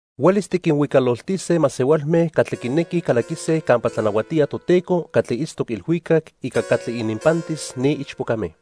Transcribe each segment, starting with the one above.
"Huelis tiquinhuicaloltise masehualme catli quinequij calaquise campa tlanahuatía Toteco catli itztoc ilhuicac ica catli ininpantis ni ichpocame.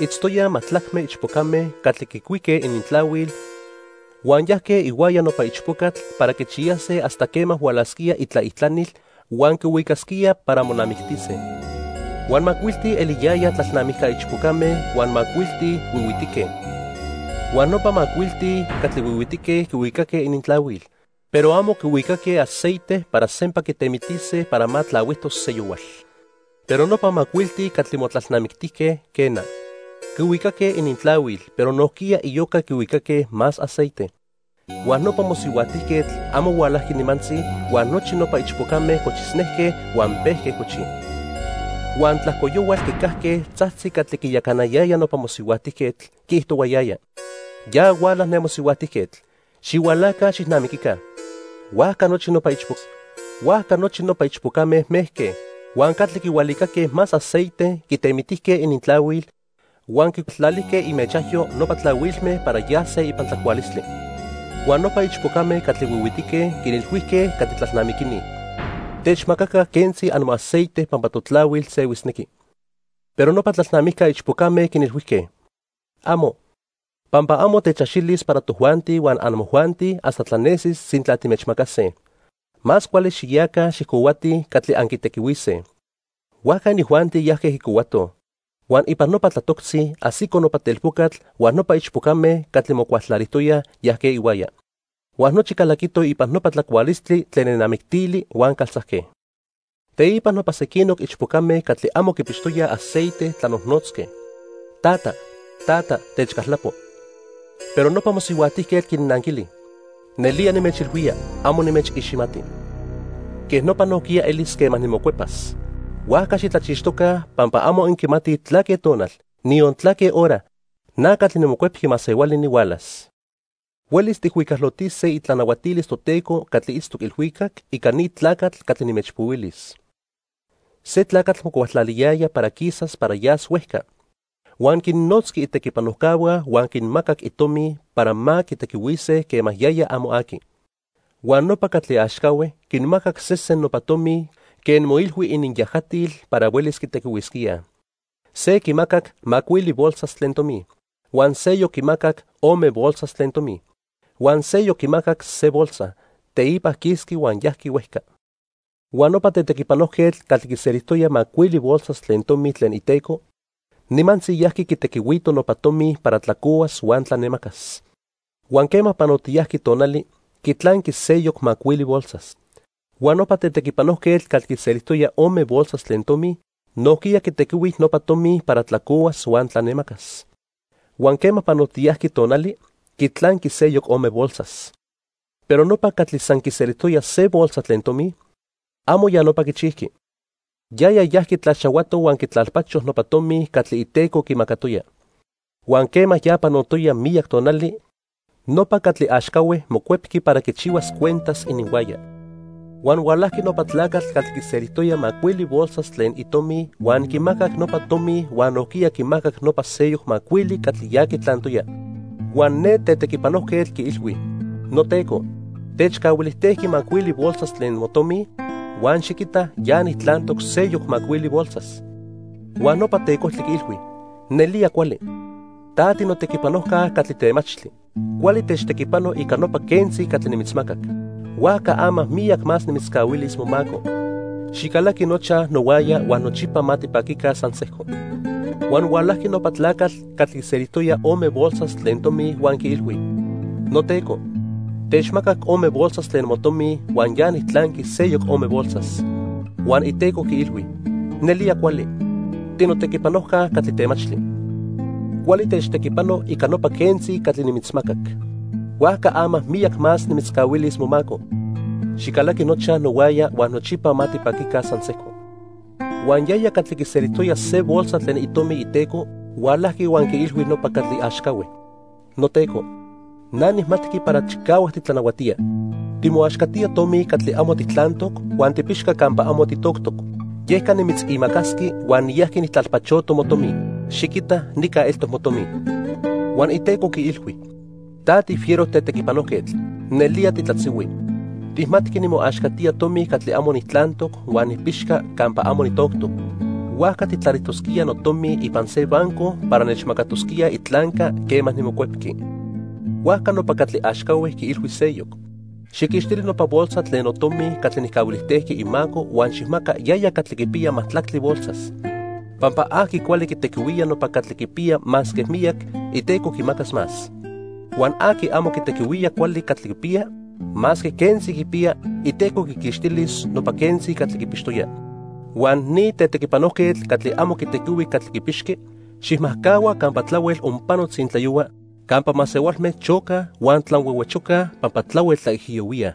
Itztoyaj majtlacme ichpocame catli quicuique inintlahuil huan yajque ihuaya nopa ichpocatl para quichiyase hasta quema hualasquía itlaijtlanil huan quihuicasquía para monamictise. Huan macuilti eliyayaj tlalnamijca ichpocame huan macuilti huihuitique. Huan nopa macuilti catli huihuitique quihuicaque inintlahuil, pero amo quihuicaque aceite para sempa quitemitise para ma tlahuijtos seyohual. Pero nopa macuilti catli motlalnamictijque, quena. Quihuicaque inintlahuil, pero nojquiya iyoca quihuicaque más aceite. Huan nopa mosihuajtijquetl amo hualajqui nimantzi huan nochi nopa ichpocame cochisnejque huan pejque cochij. "Huan tlajco yohual quicajque tzajtzi catli quiyacanayaya nopa mosihuajtijquetl, quiijtohuayaya: 'Ya huala ne mosihuajtijquetl, xihualaca xijnamiquica.' Huajca nochi nopa ichpocame mejque, huan catli quihualicaque más aceite quitemitijque inintlahuil huan quicualtlalijque imechajyo nopa tlahuilme para yase ipan tlacualistli. Huan nopa ichpocame catli huihuitique quinilhuijque catli tlalnamiquini: 'Techmacaca quentzi amoaceite pampa totlahuil sehuisnequi.' "Pero nopa tlalnamijca ichpocame quinilhuijque: 'Amo, pampa amo techaxilis para tojuanti huan amojuanti hasta tlanesis sintla timechmacase. Más cuali xiyaca xijcohuatij catli anquitequihuise.' "Huajca inijuanti yajque quicohuatoj. Huan ipan nopa tlatoctzi ajsico nopa telpocatl huan nopa ichpocame catli mocualtlalijtoyaj yajque ihuaya. Huan nochi calaquitoj ipan nopa tlacualistli tlen nenamictili huan caltzajque. Teipa nopa sequinoc ichpocame catli amo quipixtoyaj aceite tlanojnotzque: 'Tata, tata, techcaltlapo.' "Pero nopa mosihuajtijquetl quinnanquili: 'Nelía nimechilhuía, amo nimechiximati.' "Quej nopa nojquiya elis quema nimocuepas, huajca xitlachixtoca pampa amo anquimatij tlaque tonal, niyon tlaque hora, na catli niMocuepqui Masehuali nihualas. "Huelis tijhuicalotise itlanahuatilis Toteco catli itztoc ilhuicac, ica ni tlacatl catli nimechpohuilis. Se tlacatl mocualtlaliyaya para quisas para yas huejca. Huan quinnotzqui itequipanojcahua huan quinmacac itomi para ma quitequihuise quema yaya amo aqui. "Huan nopa catli axcahue quinmacac sesen nopa tomi quen moilhui ininyajatil para huelis quitequihuisquíaj. Se quimacac macuili bolsas tlen tomi, huan seyoc quimacac ome bolsas tlen tomi, huan seyoc quimacac se bolsa. Teipa quisqui huan yajqui huejca. Huan nopa tetequipanojquetl catli quiselijtoya macuili bolsas tlen tomi tlen iteco nimantzi yajqui quitequihuito nopa tomi para tlacohuas huan tlanemacas, huan quema panotiyajqui tonali, quitlanqui seyoc macuili bolsas. Huan nopa tetequipanojquetl catli quiselijtoya ome bolsas tlen tomi nojquiya quitequihui nopa tomi para tlacohuas huan tlanemacas. Huan quema panotiyajqui tonali, quitlanqui seyoc ome bolsas. Pero nopa catli san quiselijtoya se bolsa tlen tomi, amo ya nopa quichijqui. Yaya yajqui tlaxahuato huan quitlalpacho nopa tomi catli iteco quimacatoya. "Huan quema ya panotoya miyac tonali, nopa catli axcahue mocuepqui para quichihuas cuentas ininhuaya. Huan hualajqui nopa tlacatl catli quiselijtoya macuili bolsas tlen itomi huan quimacac nopa tomi huan nojquiya quimacac nopa seyoc macuili catli ya quitlantoya. Huan ne tetequipanojquetl quiilhui: 'Noteco, techcahuilijtejqui macuili bolsas tlen motomi, huan xiquita ya nijtlantoc seyoc macuili bolsas.' Huan nopa tecojtli quiilhui: 'Nelía cuali. Ta tinotequipanojca catli temachtli. Cuali techtequipano ica nopa quentzi catli nimitzmacac. Huajca ama miyac más nimitzcahuilis momaco. Xicalaqui nochaj nohuaya huan nochipa ma tipaquica san sejco.' "Huan hualajqui nopa tlacatl catli quiselijtoya ome bolsas tlen tomi huan quiilhui: 'Noteco, techmacac ome bolsas tlen motomi huan ya nijtlanqui seyoc ome bolsas.' "Huan iteco quiilhui: 'Nelía cuali. Tinotequipanojca catli temachtli. Cuali techtequipano ica nopa quentzi catli nimitzmacac. Huajca ama miyac más nimitzcahuilis momaco. Xicalaqui nochaj nohuaya huan nochipa ma tipaquica san sejco.' "Huan yaya catli quiselijtoya se bolsa tlen itomi iteco hualajqui huan quiilhui nopa catli axcahue: 'Noteco, na nijmatqui para chicahuac titlanahuatía. Timoaxcatía tomi catli amo tijtlantoc huan tipixca campa amo tijtoctoc. Yeca nimitzimacasqui huan niyajqui nijtlalpachoto motomi. Xiquita nica eltoc motomi.' "Huan iteco quiilhui: 'Ta tifiero tetequipanojquetl. Nelía titlatzihui. Tijmatqui nimoaxcatía tomi catli amo nijtlantoc huan nipixca campa amo nijtoctoc. Huajca tijtlalijtosquía notomi ipan se banco para nechmacatosquíaj itlanca quema nimocuepqui.' "Huajca nopa catli axcahue quiilhui seyoc: 'Xijquixtili nopa bolsa tlen notomi catli nijcahuilijtejqui imaco huan xijmaca yaya catli quipiya majtlactli bolsas. Pampa aqui cuali quitequihuía nopa catli quipiya masque miyac, iteco quimacas más. Huan aqui amo quitequihuía cuali catli quipiya, masque quentzi quipiya, iteco quiquixtilis nopa quentzi catli quipixtoya. Huan ni tetequipanojquetl catli amo quitequihui catli quipixqui, xijmajcahua campa tlahuel onpano tzintlayohua, campa masehualme chocaj huan tlanhuehuechocaj pampa tlahuel tlaijiyohuíaj.'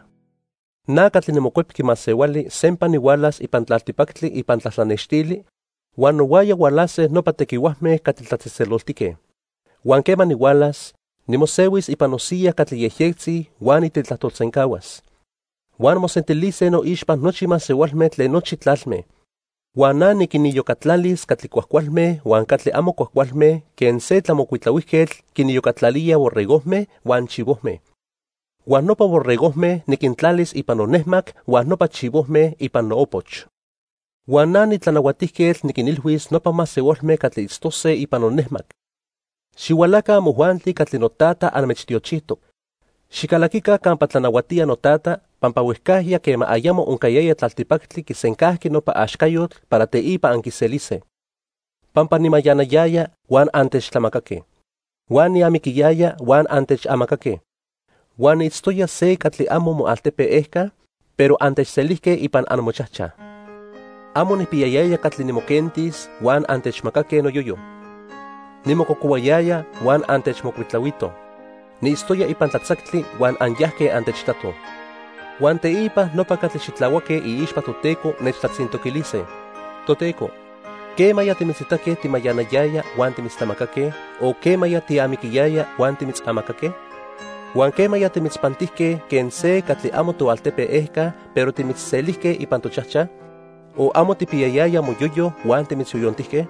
"Na catli niMocuepqui Masehuali sempa nihualas ipan tlaltipactli ipan tlatlanextli huan nohuaya hualase nopa tequihuajme catli tlatzejtzeloltique. Huan quema nihualas, nimosehuis ipan nosiya catli yejyectzi huan nitetlajtolsencahuas. Huan mosentilise noixpa nochi masehualme tlen nochi tlalme. Huan na niquiniyocatlalis catli cuajcualme huan catli amo cuajcualme quen se tlamocuitlahuijquetl quiniyocatlalía borregojme huan chivojme. Huan nopa borregojme niquintlalis ipan nonejmac huan nopa chivojme ipan noopoch. Huan na nitlanahuatijquetl niquinilhuis nopa masehualme catli itztose ipan nonejmac: 'Xihualaca amojuanti catli noTata anmechtiochijtoc. Xicalaquica campa tlanahuatía noTata, pampa huejcajya quema ayamo oncayaya tlaltipactli, quisencajqui nopa axcayotl para teipa anquiselise. Pampa nimayanayaya huan antechtlamacaque huan niamiquiyaya huan antechamacaque. Huan niitztoya se catli amo moaltepe ejca, pero antechselijque ipan amochajchaj. Amo nijpiyayaya catli nimoquentis huan antechmacaque noyoyo. Nimococohuayaya huan antechmocuitlahuitoj. Niitztoya ipan tlatzactli huan anyajque antechitatoj.' "Huan teipa nopa catli xitlahuaque iixpa Toteco nechtlatzintoquilise: 'Toteco, ¿quemaya timitzitaque timayanayaya huan timitztlamacaque, o quema tiamiquiyaya huan timitzamacaque? Huan ¿quemaya timitzpantijque quen se catli amo toaltepe ejca, pero timitzselijque ipan tochajchaj, o amo tijpiyayaya moyoyo huan timitzyoyontijque?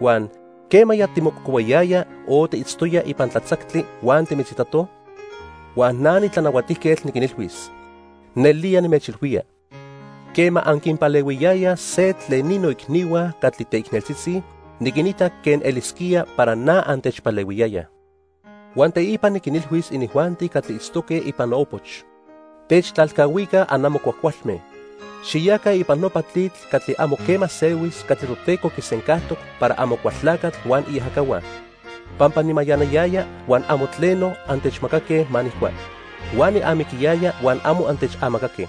Huan ¿quemaya timococohuayaya o tiitztoya ipan tlatzactli huan timitzitatoj?' "Huan na niTlanahuatijquetl niquinilhuis: 'Nelía nimechilhuía, quema anquipalehuiyayaj se tlen ni noicnihua catli teicneltzitzi, niquitac quen elisquía para na antechpalehuiyayaj.' "Huan teipa niquinilhuis inijuanti catli itztoque ipan noopoch: 'Techtlalcahuica anamo cuajcualme. Xiyaca ipan nopa tlitl catli amo quema sehuis catli Toteco quisencajtoc para Amocualtlacatl huan iajacahua. Pampa nimayanayaya huan amo tleno antechmacaque ma nijcua, huan niamiquiyaya huan amo antechamacaque.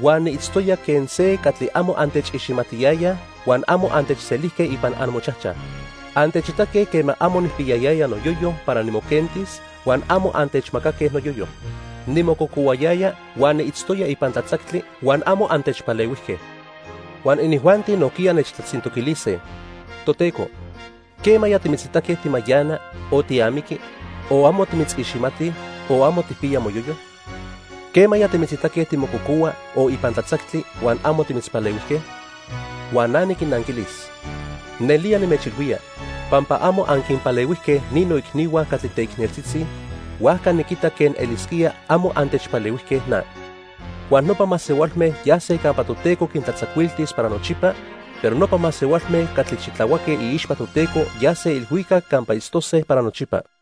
Huan niitztoya quen se catli amo antechiximatiyayaj, huan amo antechselijque ipan amochajchaj. Antechitaque quema amo nijpiyayaya noyoyo para nimoquentis, huan amo antechmacaque noyoyo. Nimococohuayaya huan niitztoya ipan tlatzactli, huan amo antechpalehuijque.' "Huan inijuanti nojquiya nechtlatzintoquilise: 'Toteco, ¿quemaya timitzitaque timayana, o tiamiqui, o amo timitziximatij, o amo tijpiya moyoyo? ¿Quemaya timitzitaque timococohua o ipan tlatzactli huan amo timitzpalehuijque?' "Huan na niquinnanquilis: 'Nelía nimechilhuía, pampa amo anquinpalehuijque ni noicnihua catli teicneltzitzi, huajca niquita quen elisquía amo antechpalehuijque na.' "Huan nopa masehualme yase campa Toteco quintlatzacuiltis para nochipa, pero nopa masehualme catli xitlahuaque iixpa Toteco yase ilhuicac campa itztose para nochipa."